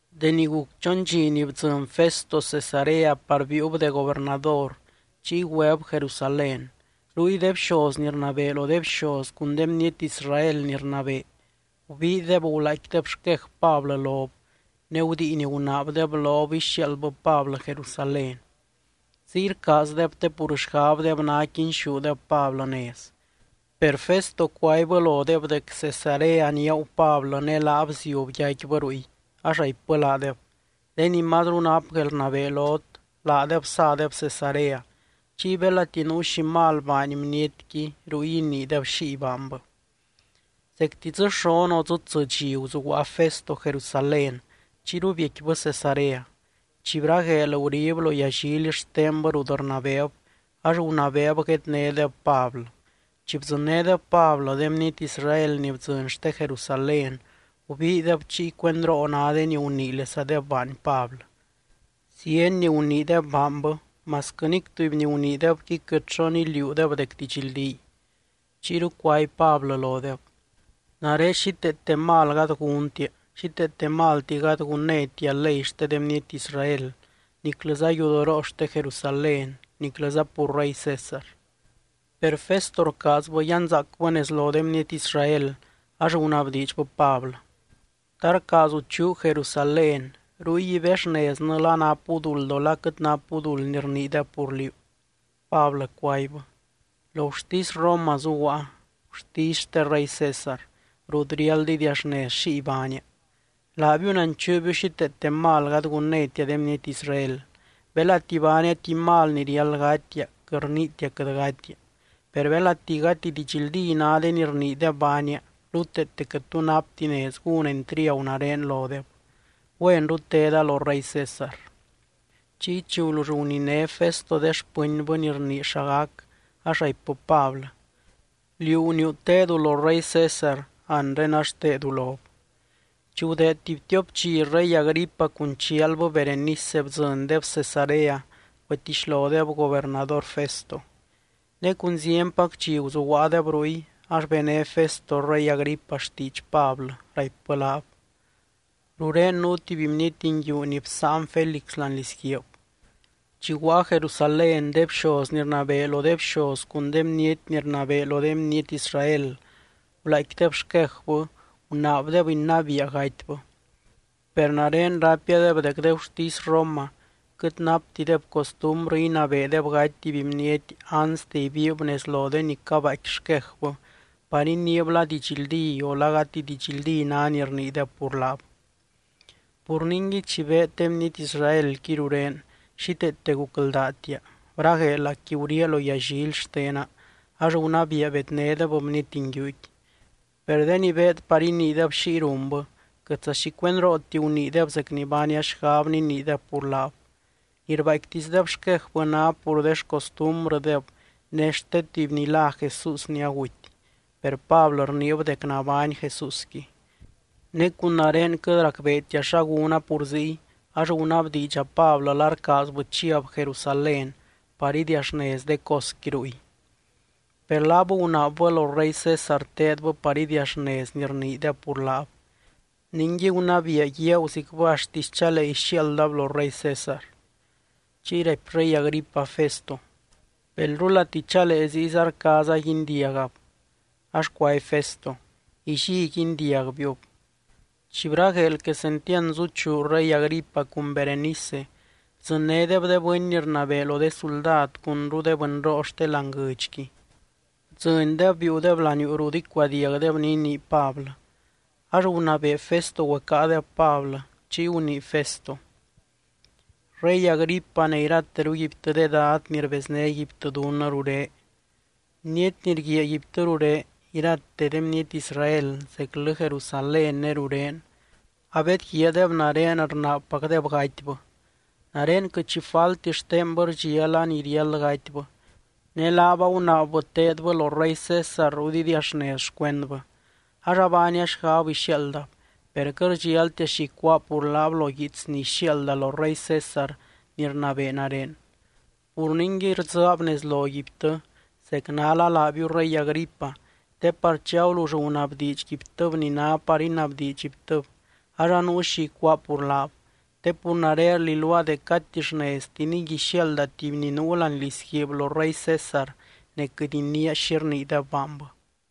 Deni guc chon dxi ni bdzɨny Festo Cesarea par biiub de gobernador, chiy güeb Jerusalén. Ruy de bxoz ni rnabee lo de bxoz cun de bniety Israel ni rnabee, gubiideb gulaaicquideb xquej Pablɨ lob, ne gudiin gunaabdeb lob ixiaaldbɨ Pablɨ Jerusalén. Ziy rcaazdeb te pur xgabdeb ná quinxúdeb Pablɨ nez. Per Festo cuaibbɨ lodeb dec Cesarea niaagu Pablɨ ne laab ziub yaicquibɨ ruy, ax raipbɨ laadeb: —De ni mazru nap guelrnabee lot, laadeb sadeb Cesarea, chiy belati nuu xi mal baany bnietqui, ruy iniideb xiy baanbɨ. Zecti dzɨ xon o dzɨ tsɨ dxi guzuguaa Festo Jerusalén, chiyru biecquibɨ Cesarea. Chi bragueel, gurib lo yallily xtenbɨ rut rnabeeb, ax gunabeeb guednédeb Pablɨ. Chi bdzɨnnédeb Pablɨ, de bniety Israel ni bdzɨny xte Jerusalén gubiideb chiy cuendroo ná de ni guniilesadeb baany Pablɨ. Zieny ni guniideb baanbɨ, masquɨ nic tuby ni guniidebqui quɨt xo niliuudeb dec didxldíy. Chiyru cuaby Pablɨ lodeb: —Nare xíteete mal gady gúntia. Xíteete malti gady gunnétia ley xte de bniety Israel, niclɨza yudoroo xte Jerusalén, niclɨza pur rey César. Per Festo rcaazbɨ yanzaacbɨ nez lo de bniety Israel, ax gunabdiidxbɨ Pablɨ: —¿Ta rcaazu chuu Jerusalén, ruy ibexneznɨ la napu duld o la quɨt napu duld ni rniideb pur liú? Pablɨ cuaibbɨ: —Lo gurtisy Roma zuguaa, gurtisy xte rey César, rut riáld idiaxnez xiy baania. Laabiu nanchuubiu xíteete malti gady gunnétia de bniety Israel. Belati baania tuby mal ni riáld gatia, quɨt rniitia quɨt gatia. Per belati gati didxldí ná de ni rniideb baania, ruteete quɨt tu napti nez gún entriagu nare lodeb. Güenru teda lo rey César. Chiy, chi gulull guniné Festo de xpɨnbɨ ni rnii xa gac, ax raipbɨ Pablɨ: —Liú guniiu tedu lo rey César, anre ax tedu lob. Chi gudeed tuby tiop dxi, rey Agripa cun chialbɨ Berenice bdzɨndeb Cesarea güetixlodeb gobernador Festo. Ne cun zienpac dxi guzuguaadeb ruy, ax bené Festo rey Agripa xtiidx Pablɨ, raipbɨ laab: —Rurén nuu tuby bniety nguiu ni bsáan Félix láani lizguiib. Chi guaa Jerusalén, de bxoz ni rnabee lo de bxoz cun de bniety ni rnabee lo de bniety Israel gulaaicquideb xquejbɨ, gunaabdeb inabiia gatybɨ. Per nare raipiadeb dec de gurtisy Roma quɨt naptideb costumbrɨ inabeedeb gaty tuby bniety anste ibiib nez lo de ni cabaaicqui xquejbɨ par iniib la didxldí, o la gati didxldí ná ni rniideb pur laab. Pur ningui, chi beed de bniety Israelqui rurén, xíteete gucldaatia, bragueelacqui guriaa lo yallily xtena, ax gunabiia bednédeb bniety nguiuqui. Per de ni beed par iniideb xiy runbɨ, quɨtza xi cuendrooti guniideb zec ni baania xgab niniideb pur laab. Ni rbaaicquitisdeb xquejbɨ ná pur de xcostumbrɨdeb ne xte tuby ni lá Jesús ni aguty, per Pablɨ rniib dec nabány Jesúsqui. Ne cun nare quɨt racbeetia xa gúna pur ziy, ax gunabdiidxa Pablɨ la rcaazbɨ chiab Jerusalén par idiaxnez de cosqui ruy. Per laab gunaabbɨ lo rey César teedbɨ par idiaxnez ni rniideb pur laab, ningui gunabiia guiaaguzicbɨ axtisy chalee ixiaaldab lo rey César. Chiy raipy rey Agripa Festo: —Belrulati chalee, ziyza rcaaza guindiagab. Ax cuaby Festo: —Illí guindiagbiub. Chi bragueel quesentiand zuchuu rey Agripa cun Berenice bdzɨnnédeb de bɨny ni rnabee lo de suldad cunru de bɨnroo xte láani guɨdxqui, bdzɨndeb biiudeb laniuu rut icuadiagdeb ni inii Pablɨ. Ax gunabee Festo güecáadeb Pablɨ, chiy gunii Festo: —Rey Agripa ne irateruguibtɨ de dad ni rbeznéguibtɨ dunnɨ ruré. Bniety ni rguiaaguibtɨ ruré, irate de bniety Israel, zeclɨ Jerusalén ne rurén abedguiaadeb nare rnaabpacdeb gatybɨ. Nare quɨt xi falti xtenbɨ rdxiala ni riáld gatybɨ. Ne laab agunaabbɨ teedbɨ lo rey César rut idiaxnez xcuendbɨ, ax abaania xgab ixiaaldab. Per quɨt rdxialtia xi icuáa pur laab lo guiits ni ixiaalda lo rey César ni rnabee nare. Pur ningui rdzɨɨab nez loguibtɨ, zec nála laabiu, rey Agripa, te par chi agulull gunabdiidxguibtɨb ni ná par inabdiidxguibtɨb ax anuu xi icuáa pur laab. Te pur nare rliluaa dec gati xneztiniy ixiaalda tuby ni nuu láani lizguiib lo rey César ne quɨt iniia xi rniideb baanbɨ.